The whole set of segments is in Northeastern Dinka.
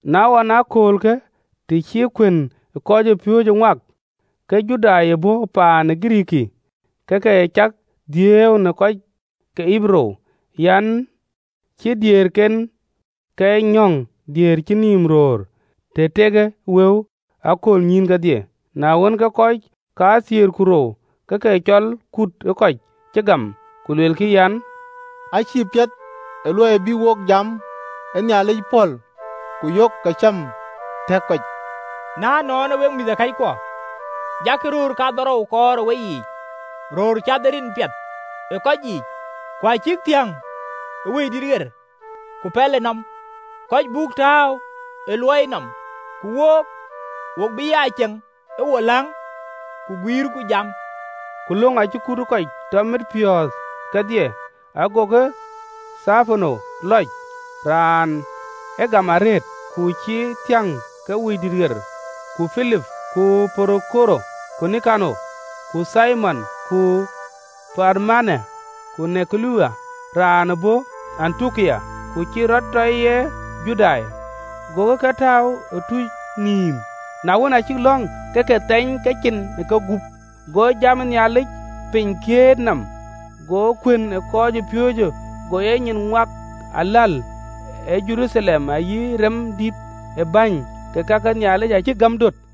Na ɣɔn ë aköölkë, të cï kuën ë kɔcpiööcë rɔt ŋuak ke Judai ë bɔ̈ paan ë Girikii ke ke cak dhiëëu në kɔc ke Ɣeberuu an, cï diëërken nyɔ̈ŋ diëër cïn nïïm röör, të tekë wëu ë aköölnyïïn kedhie. Na wën, ke kɔc kathiëër ku rou ke ke cɔl kut ë kɔc cï gam, ku luelkï an, “Acïï piɛth ë luɔi bï wo jam ë Nhialic pɔ̈l, ku yok kacam tɛ̈k kɔc. Na ënɔɔnë, wek mïthëkɔckuɔ, jakï röör kadhorou kɔɔr ë weyiic, röör cath ë rin piɛth ë kɔc yiic, ku cïk thiäŋ ë Wëidït ku pɛlënɔm, kɔc buk tääu ë luɔiyë nɔm. Ku wook, wo bï ya ceŋ ë wo läŋ, ku guiirku jam.” Ku löŋë acï kut ë kɔc tɔ mit piɔ̈ɔ̈th kedhie, agokï Thepano lɔc, raan ë gam arëët, ku cï thiäŋ ke Wëidït ɣer, ku Pilip, ku Porokoro, ku Nikanor, ku Thimon, ku Parmena, ku Nikola raan ë bɔ̈ Antiokia ku cï rɔt tɔ ye Judai. Gokï ke tääu ë tuuc nïïm: na wën aa cïk lɔ̈ŋ, ke ke thɛny kecin ë kegup. Go jam ë Nhialic piny kiët nɔm: go kuën ë kɔc piööcë go e nyin ŋuak aläl ë Jeruthalem, ayï rem dïït ë bäny ke ka ke Nhialic acïk gäm döt.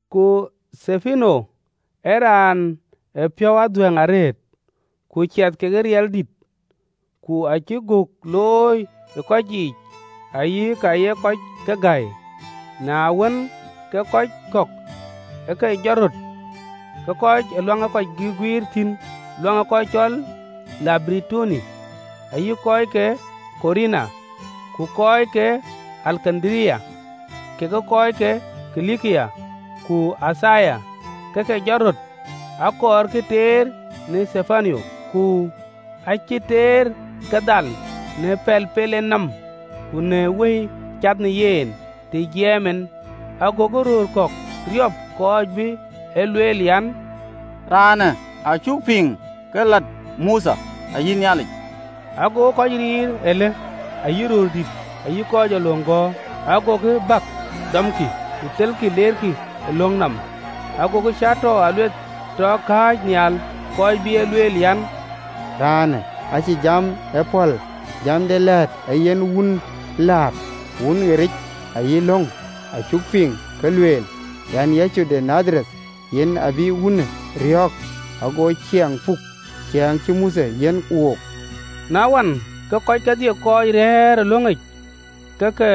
Ku Thepano ee raan ee piɔ̈u adhuɛ̈ŋ arëët, ku ciɛth ke riɛldït, ku acï göök looi ë kɔc yiic ayï ka ye kɔc ke gäi. Na wën, ke kɔc kɔ̈k ë ke jɔt röt, kɔc ke luaŋ ee kɔc guëër thïn luaŋ ë kɔc cɔl Libertinoi, ayï kɔc ke Kurene, ku kɔc ke Alekandaria, kekë kɔc ke Kilikia, ku Athia, ke ke jɔt röt, akɔɔrkï teer në Thepano. Ku acï teer ke dhal, në pɛl pel en nɔm, ku në Wëi cath në yen, të jiɛɛm en. Agokï röör kɔ̈k riɔp, kɔc bï e lueel, an, “Raanë acuk piŋ ke lat Mothe, ayï Nhialic!” Agokï kɔc riir aläl ayï röördït, ayï kɔc ee löŋ gɔ̈ɔ̈r, agokï bäk, dɔmkï, ku thelkï leerkï ë löŋ nɔm. Agokï cäätɔɔ aluɛth tɔ kääc nhial, kɔc bï e lueel an, “Raanë acïï jam ee pɔ̈l jam de lɛ̈ɛ̈t ee yen tëɣericë läät, ayï löŋ: acuk piŋ ke lueel an, Yecu de Nadhareth, yen abï wunë riɔ̈ɔ̈k, ago ciɛɛŋ puk, ciɛɛŋ cï Mothe yiɛ̈n wook!” Na wën, ke kɔc kedhie kɔc rɛ̈ɛ̈r ë löŋic, ke ke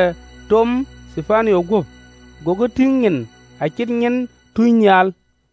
tom Thepano guöp, gokï tïŋ nyin, acït nyin tunynhial.